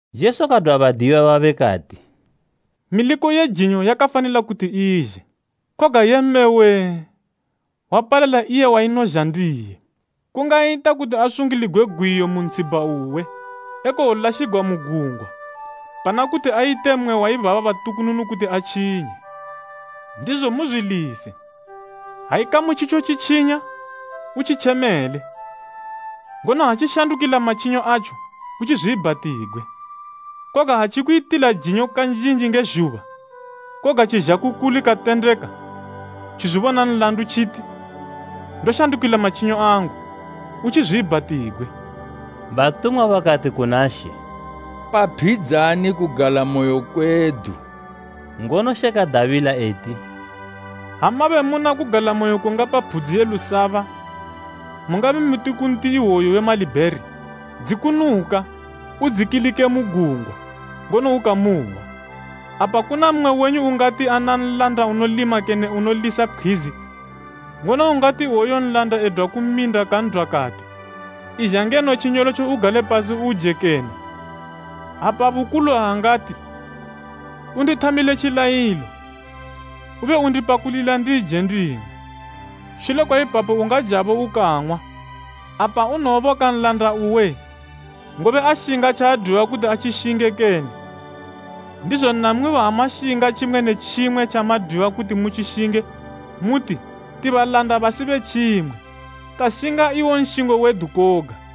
Jesu kadwa badiyiwa babe kati, “Miliko ye jinyo yakafanila kuti izhe, koga yee mme wee! Wapalala iye wainozha ndiye. Kungayita kuti asungiligwe gwiyo mu ntshibha uwe, ekowolashigwa mu gungwa, pana kuti ayite mmwe waibaba batukununu kuti atjinye.” Ndizo muzwilise, “Ha ikamu tjitjo tjitjinya, utjitjemele, ngono ha tjishandukila matjinyo atjo, utjizwiibhatigwe. Koga ha tjikuyitila jinyo kanjinji nge zhuba, koga tjizha ku kuli katendeka, tjizwibona nlandu tjiti, ‘Ndoshandukila matjinyo angu,’ utjizwiibhatigwe.” Batumwa bakati kuna She, “Paphidzani kugalamoyo kwedu.” Ngono She kadabila eti, “Ha mabe muna kugalamoyo kungapa phudzi ye lusaba, mungabe muti ku nti iwoyu we malibheri, ‘Dzikunuka, udzikilike mu gungwa,’ Ngono ukamuhwa.” “Apa kuna mmwe wenyu ungati ana nlanda unolima kene unolisa pkhwizi, ngono ungati iwoyo nlanda edwa ku minda kan'dwa kati, ‘Izha ngeno tjinyolotjo ugale pasi uje kene?’ Apa bukulu aangati, ‘Undithamile tjilayilo, ube undipakulila ndije nding'we, shule kwaipapo ungajabo ukang'wa?’ Apa unowoboka nlanda uwe, ngobe ashinga tjaadwiwa kuti atjishinge kene? Ndizo namwibo ha mashinga tjimwe ne tjimwe tjamadwiwa kuti mu tjishinge, muti, ‘Ti balanda basi betjimwe, tashinga iwo nshingo wedu koga.’”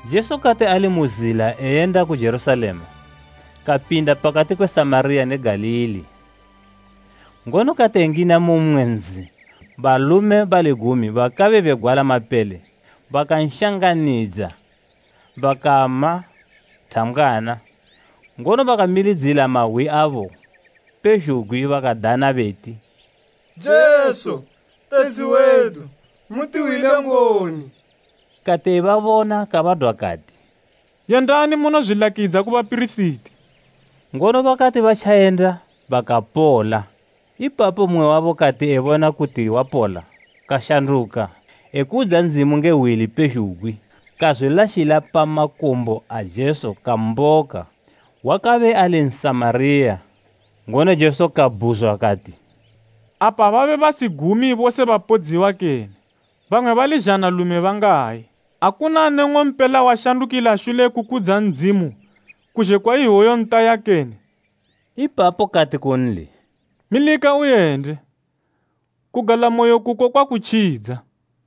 Jesu kati ali mu zila eyenda ku Jerusalema, kapinda pakati kwe Samariya ne Galili. Ngono kati engina mu mmwe nzi, balume bali gumi bakabe begwala mapele bakanshanganidza, bakama thambgwana, ngono bakamilidzila mahwi abo pezhugwi bakadana beti, “Jesu, Tetshi wedu, mutihwile ngoni!” Kati ebabona kabadwa kati, “Yendani munozwilakidza ku bapirisiti.” Ngono bakati batjayenda bakapola. Ipapo mmwe wabo kati ebona kuti wapola kashanduka, ekudza Ndzimu nge hwi lipezhugwi. Kazwilashila pa makumbo a Jesu kamboka. Wakabe ali Nsamariya. Ngono Jesu kabhuzwa kati, “Apa babe basi gumi bose bapodziwa kene? Bamwe bali zhanalume bangayi? Akuna ne ng'ompela washandukila shule kukudza Ndzimu, kuzhe kwa iwoyu ntaya kene?” Ipapo kati kunli, “Milika uyende, kugalamoyo kuko kwakutjidza.”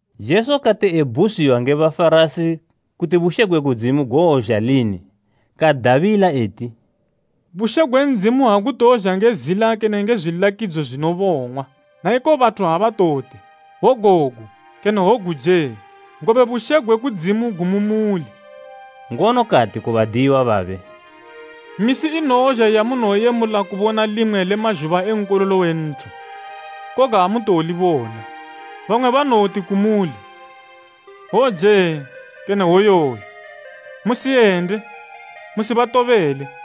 Jesu kati ebhuzwiwa nge Bafarasi kuti bushe gwe Ndzimu gowozha lini, kadabila eti, “Bushe gwe Ndzimu agutowozha nge zila kene nge zwilakidzo zwinobong'wa, naiko bathu abatowoti ‘Wogogu kene wogu jee!’ Ngobe bushe gwe kudzimu gu mu muli.” Ngono kati ku badiyiwa babe, “Misi inowozha yamunowoyemula kubona limwe le mazhuba e Nkololo we Nthu, koga amutowolibona. Bamwe banowoti kumuli, ‘Wojee!’ Kene ‘Woyoyu!’ Musiyende, musibatobele.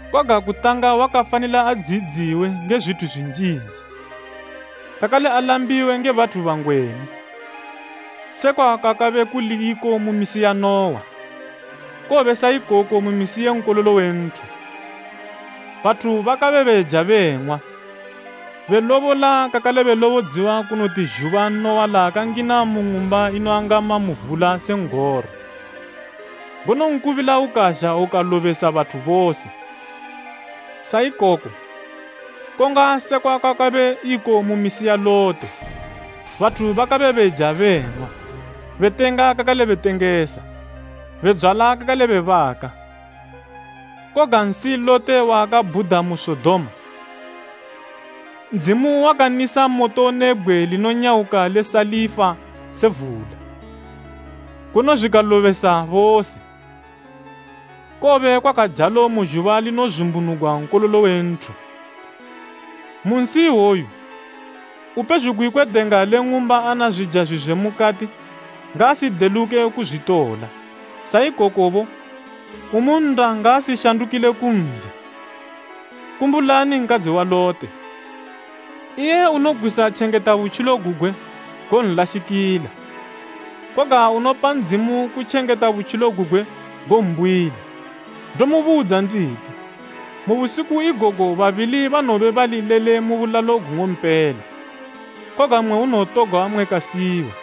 Koga kutanga wakafanila adziyidziwe nge zwithu zwinjinji, kakale alambiwe nge bathu bangwenu. Sekwa kwakabe kuli iko mu misi ya Nuwa, kowobe sa ikoko mu misi ye Nkololo we Nthu. Bathu bakabe beja beng'wa, belobola kakale belobodziwa kunoti zhuba Nuwa laakangina mu ng'umba inoangama mu vula se n'goro, ngono nkubila ukazha ukalobesa bathu bose. —19:25Sa ikoko, konga sekwa kwakabe iko mu misi ya Lote, bathu bakabe beja beng'wa, betenga kakale betengesa, bedzwala kakale bebaka, koga nsi Lote waakabhuda mu Sodoma, Ndzimu wakanisa moto ne bgwe linonyawuka le salifa se vula, ngono zwikabalobesa bose. Kowobe kwakajalo mu zhuba linozumbunugwa Nkololo we Nthu. “Mu nsi iwoyu upezhugwi kwe denga le ng'umba ana zwija zwizwe mukati, ngaasideluke kuzwitola. Sa ikokobo, umu nnda ngaasishandukile ku nzi. Kumbulani nkadzi wa Lote. Iye unogwisa tjengeta butjilo gugwe, gonlashikila, koga unopa Ndzimu kutjengeta butjilo gugwe, gombuyila. Ndomubudza nditi, mu busiku igogo babili banowobe bali lele mu bulalo gung'ompela, koga mmwe unowotogwa mmwe kasiyiwa.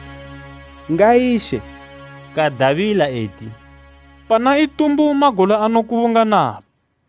Bakabhuzwa bakati, “Ngayi She?” Kadabila eti, “Pana itumbu magola anokubunganapo.”